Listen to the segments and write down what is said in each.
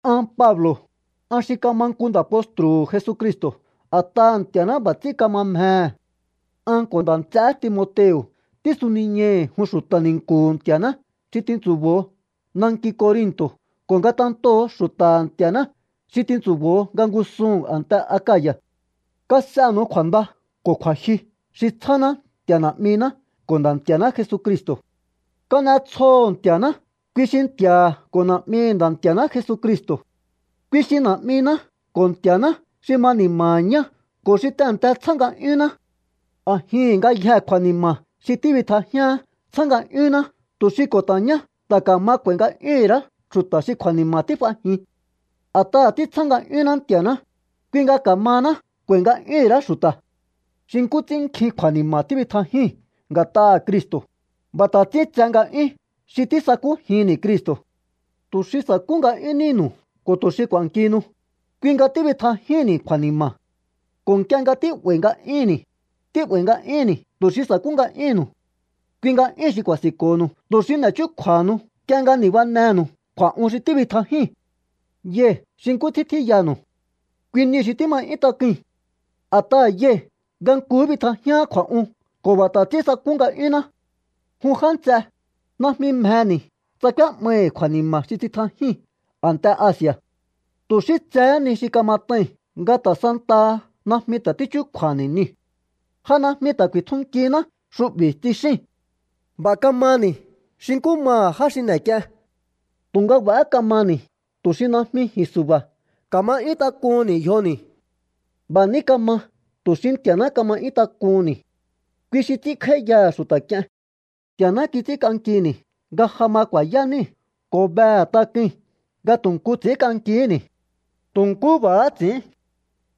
An Pablo̱, an xi kama nku nda̱ postru̱hu̱ Jesucristo̱ a̱t'aha̱ Nti̱a̱ná b'a̱ ts'ín kama mjehe. An ko̱ nda̱ nts'eé Timoteo̱ tísuniñai̱hi̱ jun xu̱ta̱ ni̱nku̱hu̱ Nti̱a̱ná xi tintsu̱bo̱o nanki Corinto̱ ko̱ ngatentoo̱ xu̱ta̱ha̱ Nti̱a̱ná xi tintsu̱bo̱o nga ngúsuhu̱n a̱nte Akaya̱. Kas'enu̱u kju̱a̱nda ko̱ kju̱a̱jyu xi tsjáná Nti̱a̱ Na̱'miná ko̱ Nda̱ Nti̱a̱ná Jesucristo̱. Kan'etsjoho̱ Nti̱a̱ná, kui xi Nti̱a̱ha̱ ko̱ Na̱'mihi̱ Nda̱ Nti̱a̱ná Jesucristo̱. Kui xi Na̱'miná ko̱ Nti̱a̱ná xi ma ni̱ma̱ha̱ ñá ko̱ xi tehe̱nte tsjá nga'yúnná. A̱jihi̱n ngayjee̱ kju̱a̱ni̱ma̱ xi tíbitjajíaán tsjá nga'yúnná tu̱ xi ko̱ ta̱ ñá ta̱ ka̱ma k'u̱a̱i̱ nga'yúhu̱n ra̱á xu̱ta̱ xi kju̱a̱ni̱ma̱ tíf'ajin. A̱t'aha̱ títsjá nga'yúnná Nti̱a̱ná, kui nga ka̱mahaná k'u̱a̱i̱ nga'yúhu̱n ra̱á xu̱ta̱. Xi nkú ts'ín nkjin kju̱a̱ni̱ma̱ tíbitjajíi̱n nga̱t'aha̱ Cristo̱, b'a̱ ta̱ ts'ín tse nga'yún xi tísakújinni̱ Cristo̱. Tu̱ xi sa̱kú nga'yún níhi̱nu̱u ko̱ tu̱ xi k'u̱a̱nkihinu, kui nga tíbitjajíhi̱nni̱ kju̱a̱ni̱ma̱. Ko̱ nk'ie nga tí'ba̱i̱ nga'yúnni̱, tí'ba̱i̱ nga'yúnni̱ tu̱ xi sa̱kú nga'yúhu̱nnu̱u. Kui nga'yúu̱n xi ku̱a̱si̱nko̱nu̱u tu̱ xi n'e̱ chúkju̱a̱nu̱u nk'ie nga ni̱banenu̱u kju̱a̱'un xi tíbitjajíi̱n. Yai̱ xi nkú ts'ín tjíyanu̱u. Kui niu̱ xi tíma 'yún tak'ui̱n. A̱t'aha̱ yai̱ nga nkuhú bitjajíaán kju̱a̱'un ko̱ b'a̱ ta̱ ts'ín sakú nga'yúnná. Jun já nts'e, najmi mjeni̱ tsa k'úé'mai̱ kju̱a̱ni̱ma̱ xi tsitjajíi̱n a̱nte Asi̱a̱. Tu̱ xí tsehé ni xi kamat'ai̱n nga ta̱ santaha najmi ta̱ tíchúkju̱a̱ha̱ni̱ niu̱. “Ja najmi ta̱ ku̱i̱tjunkihiná xu'bi̱”, tsixíi̱n. B'a̱ kamani̱ xi nkú maha̱ já xi n'e̱k'ien. Tu̱nga b'a̱há kamani̱ tu̱ xi najmi ji̱n su̱ba̱ ka̱ma 'yún tak'uhu̱nni̱ yjoni̱. B'a̱ ní kama tu̱ xi Nti̱a̱ná ka̱ma 'yún tak'uhu̱nni̱. Kui xi ts'ínkj'áíyaha̱ xu̱ta̱ k'ie̱n. Nti̱a̱ná kits'ínk'ankini̱ nga ja ma ku̱a̱yá níi̱ ko̱ behe̱ tak'ui̱n nga tu̱ nku ts'i̱ínk'ankihíni̱. Tu̱ nkú b'a̱há ts'i̱ín.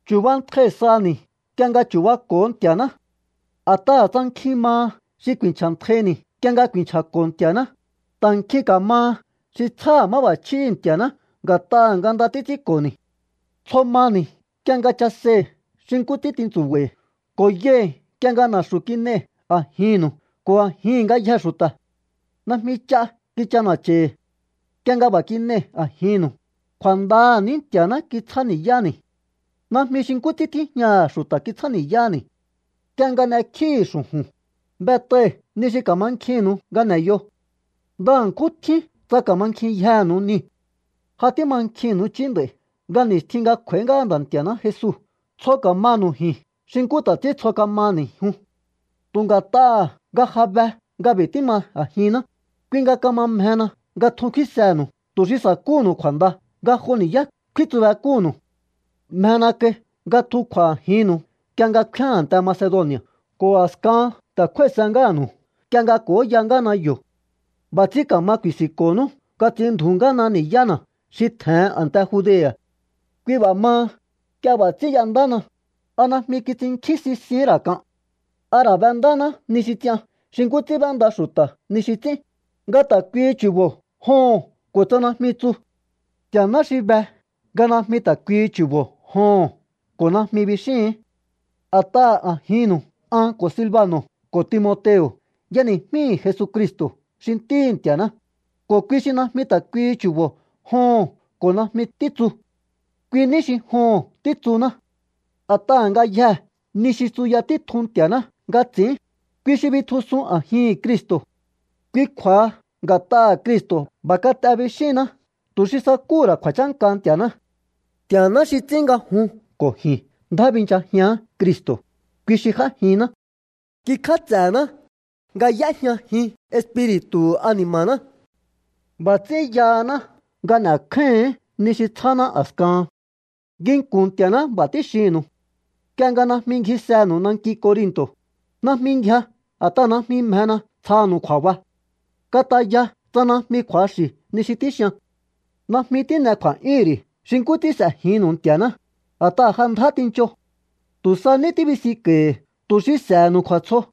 Chu̱bantjai saha̱ni̱ nk'ie nga chu̱bako̱o Nti̱a̱ná. A̱t'aha̱ tsa nkjin maha xi ku̱i̱nchja̱ntjaini̱ nk'ie nga ku̱i̱nchja̱ko̱ Nti̱a̱ná, ta̱ nkjin ka̱maha xi tsjáha̱ máb'a̱chjíhi̱ Nti̱a̱ná nga̱t'aha̱ nga nda títs'ínko̱ni̱. Tsjo mani̱ nk'ie nga chasei̱ xi nkú ts'ín tintsu̱ba̱i̱ ko̱ yai̱ nk'ie nga na̱xu̱ kin'ei̱ a̱jihi̱nnu̱u ko̱ a̱jihi̱n ngayjee̱ xu̱ta̱. Najmi ch'a kich'ana̱cha̱i̱hi̱. Nk'ie nga b'a̱ kin'ei̱ a̱jinnu̱u, kju̱a̱ndaha̱ ní Nti̱a̱ná kitsjáni̱yáni̱. Najmi xi nkú ts'ín tíjñaha̱ xu̱ta̱ kitsjáni̱yáni̱. Nk'ie nga n'ekjíi̱hi̱ xu̱ju̱n, b'et'ai̱hi̱ ni xi ka̱mankjinnu̱u nga n'e̱yo. Nda ṉkjún tjín tsa ka̱mankjinyjenu̱u niu̱. Ja tímankjinnu̱u i̱chí nd'a̱i̱ nga ni̱stjin nga kj'u̱a̱í ngáha Nda̱ Nti̱a̱ná Jesu tsjo ka̱manu̱u ji̱n xi nkú ta̱ ts'ín tsjo ka̱mani̱ jun. Tu̱ nga̱t'aha̱ nga ja be nga b'i̱ tíma a̱jinná, kui nga kama mjehena nga tjun kfínsehe̱nu̱u tu̱ xi sa̱kúhu̱nu̱u kju̱a̱nda nga jo ni̱yá kfíntsubek'úhu̱nnu̱u. Mjena kai nga tjun kj'u̱a̱ a̱jinnu̱u nk'ie nga kfíán a̱nte Macedoni̱a̱ ko̱ a̱skahan ta̱ kjúái̱sehé ngáha̱nu̱u nk'ie nga k'o̱óya ngáhana yo̱. B'a̱ ts'ín ka̱ma ku̱i̱si̱nko̱honú nga ts'inndju̱ú ngáhana ni̱yána̱ xi tje̱hen a̱nte Judea̱. Kui b'a̱ maha, nk'ie b'a̱ ts'ín y'endáhana, ¿a najmi kits'innkjín sisihín ra̱ k'an? ¿A ra̱ b'endáná ni xi ts'ian xi nkú ts'ín b'énda xu̱ta̱ ni xi ts'ín, nga ta̱ kuihi chu̱bo̱ “joho̱n” ko̱ tsa “najmi” tsu? Nti̱a̱ná xi be nga najmi ta̱ kuihi chu̱bo̱ “joho̱n” ko̱ “najmi” bixíi̱hi̱n. A̱t'aha̱ a̱jinnu̱u an ko̱ Silbano̱ ko̱ Timoteo̱ y'eni̱jmíi̱ Jesucristo̱ xi Ntíhi̱ Nti̱a̱ná, ko̱ kui xi najmi ta̱ kuihi chu̱bo̱ “joho̱n” ko̱ “najmi” títsu. Kui ní xi “joho̱n” títsuná. A̱t'aha̱ ngayjee̱ ni xi tsuya títjun Nti̱a̱ná nga ts'i̱ín, kui xi bitjusun a̱jihi̱n Cristo̱. Kui kju̱a̱ha nga̱t'aha̱ Cristo̱ “b'a̱ kat'e” bixíhinná tu̱ xi sakúhu̱ ra̱ kju̱a̱chánka Nti̱a̱ná. Nti̱a̱ná ts'ín nga jun ko̱ ji̱n ndjá binchajián Cristo̱, kui xi j'ájinná. Kikj'áts'e̱ná nga y'éjñajin Espiri̱tu̱hu̱ ani̱ma̱ná. B'a̱ ts'ín yahaná nga n'e̱kjáíhi̱ín ni xi tsjáná a̱skahan. Nginku̱n Nti̱a̱ná b'a̱ tíxinnu̱u: Nk'ie nga najmi ngjisenu̱u nanki Corinto̱, najmi ngjia a̱t'aha̱ najmi mjena tsjanu̱u kju̱a̱ba. Kataya tsa najmi kju̱axi̱ ni xi tíxian. Najmi tín'e kju̱a̱'yúhu̱n ri̱ xi nkú ts'ín s'e̱jinnu̱u Nti̱a̱ná, a̱t'aha̱ ja ndjá tincho. Tu̱ sa ní tíbisinko̱i̱hi̱ tu̱ xi s'e̱he̱nu̱u kju̱a̱tsjo.